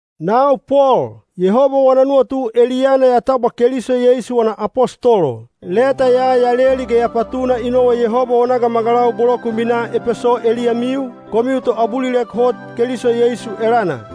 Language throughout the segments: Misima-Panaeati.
Nau Pol, Yehoba wana nuwatu eliyana ya tabwa Keliso Yeisu wana apostolo. Leta ya ya leli ge ya patuna i nowa Yehoba wana gamagalau bolo ku minaa Epeso eliyamiu, komiu toabulilek hot Keliso Yeisu elana.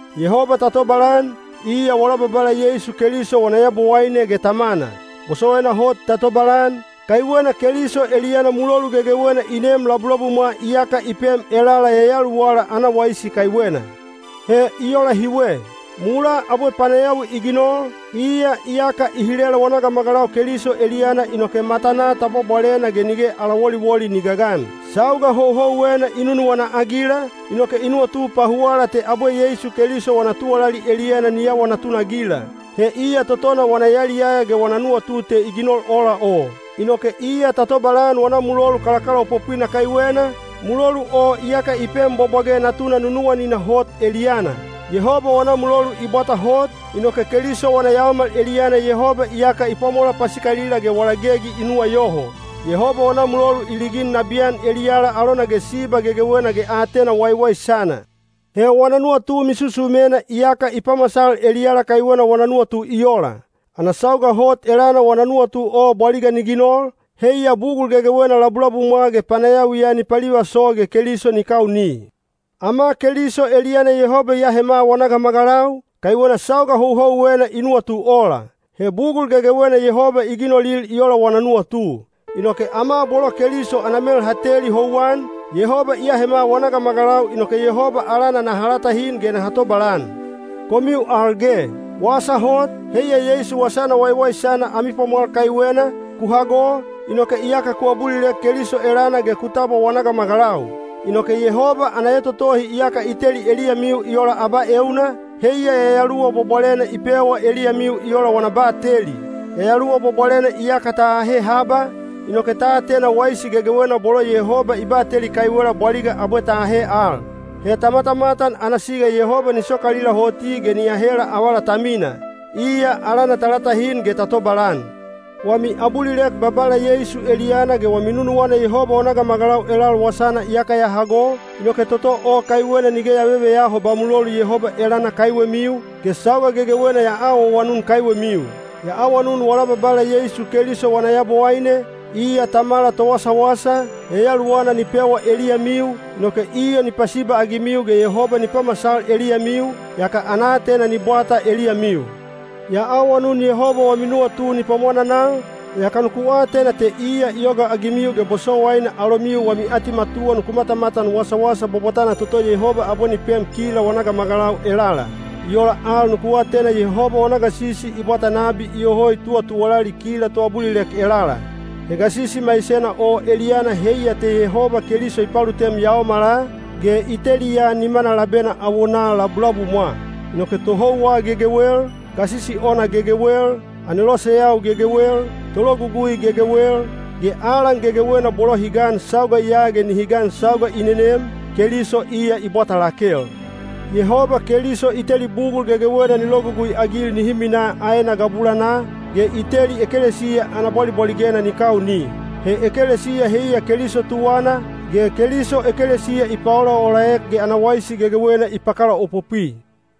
Yehoba ta tobalan, iya wala Babala Yeisu Keliso wana Yabowaine ge Tamana. Bosowaina hot ta tobalan, kaiwena Keliso eliyana mulolu gegewena i neem labulabumwa iyaka i pem elala yayaluwala ana waisi kaiwena. He i ola hiwe. Mulaa abwe panayawi i ginol, iya iyaka i hilela wana gamagalau Keliso eliyana inoke matanaa ta bwabwalena ge nige ala woliwoli ni gagan. Sauga houhouwena i nunuwana-agila, inoke i nuwatu pahuwala te abwe Yeisu Keliso wana tuwalali eliyana ni awa natunagila. He iya totona wana yaliyaya ge wana nuwatu te i ginol ola o. Inoke iya ta tobalan wana mulolu kalakalaopopwina kaiwena, mulolu o iyaka i pem bwabwage Natuna nunuwanina hot eliyana. Yehoba wana mulolu i bwata hot, inoke Keliso wana yaomal eliyana Yehoba iyaka i pwamola pasikalila ge wala gegi i nuwayoho. Yehoba wana mulolu i ligin nabiyan eliyala alona ge siba gegewena ge aatena waiwaisana. He wana nuwatu misusumena iyaka i pamasal eliyala kaiwena wana nuwatu i ola. Ana sauga hot elana wana nuwatu o bwaliga ni ginol, heiya bugul gegewena labulabumwa ge panayawiya ni palivaso ge Keliso ni kauni. Ama Keliso eliyana Yehoba i ahema wana gamagalau, kaiwena sauga houhouwena i nuwatu ola. (He bugul gegewena Yehoba i ginolil i ola wana nuwatu.) Inoke ama bolo Keliso ana mel ha teli houwan, Yehoba i ahema wana gamagalau inoke Yehoba alana naha latahin ge naha tobalan. Komiu al ge, wasa hot, heiya Yeisu Wasana Waiwaisana ami pwamwal kaiwena, ku hago, inoke iyaka ku abulilek Keliso elana ge ku tabwa wana gamagalau. Inoke Yehoba ana etotohi iyaka i teli eliyamiu i ola abaeuna, heiya Yayaluwa Bwabwalena i pewa eliyamiu i ola wana bateli. Yayaluwa Bwabwalena iyaka ta ahe haba, inoke ta atena waisi gegewena bolo Yehoba i bateli kaiwela bwaliga abwe ta ahe al. He ta matamatan ana siga Yehoba ni sokalila hoti ge ni ahela avala ta mina. Iya alana ta latahin ge ta tobalan! Wami abulilek Babala Yeisu eliyana ge wami nunuwana Yehoba wana gamagalau elal wasana iyaka ya hago, inoke toto o kaiwena nige ya veveyaho ba mulolu Yehoba elana kaiwemiu, ge sauga gegewena ya awaawanun kaiwemiu. Ya awanun wala Babala Yeisu Keliso wana Yabowaine, iya Tamala Towasawasa, Yayaluwana ni pewa eliyamiu, inoke iya ni pasiba-agimiu ge Yehoba ni pamasal eliyamiu, yaka ana aatena ni bwata eliyamiu. Ya awanun Yehoba wami nuwatu ni pwamwananal, yaka nuku atena te iya i yogaagimiu ge bosowaina alomiu wami atimatuwa nuku matamatan wasawasa bwabwatana toto Yehoba abwe ni pem kila wana gamagalau elala. I ola al nuku atena Yehoba wana gasisi i bwata nabi iyoho i tuwatuwalali kila toabulilek elala. He gasisi maisena o eliyana heiya te Yehoba Keliso i palutem yaomala, ge i teliya nimana labena awonaa labulabumwa. Inoke tohouwa gegewel, gasisi ona gegewel, aneloseyau gegewel, tologugui gegewel, ge alan gegewena bolo hi gan sauga ya ge nihi gan sauga i nenem, Keliso iya i bwata lakel. Yehoba Keliso i teli bugul gegewena ni logugui-agil nihi minaa aena gabulanaa, ge i teli ekelesiya ana bwalibwaligena ni kauni. He ekelesiya heiya Keliso tuwana, ge Keliso ekelesiya i paolaolaek ge ana waisi gegewena i pakalaopopwi.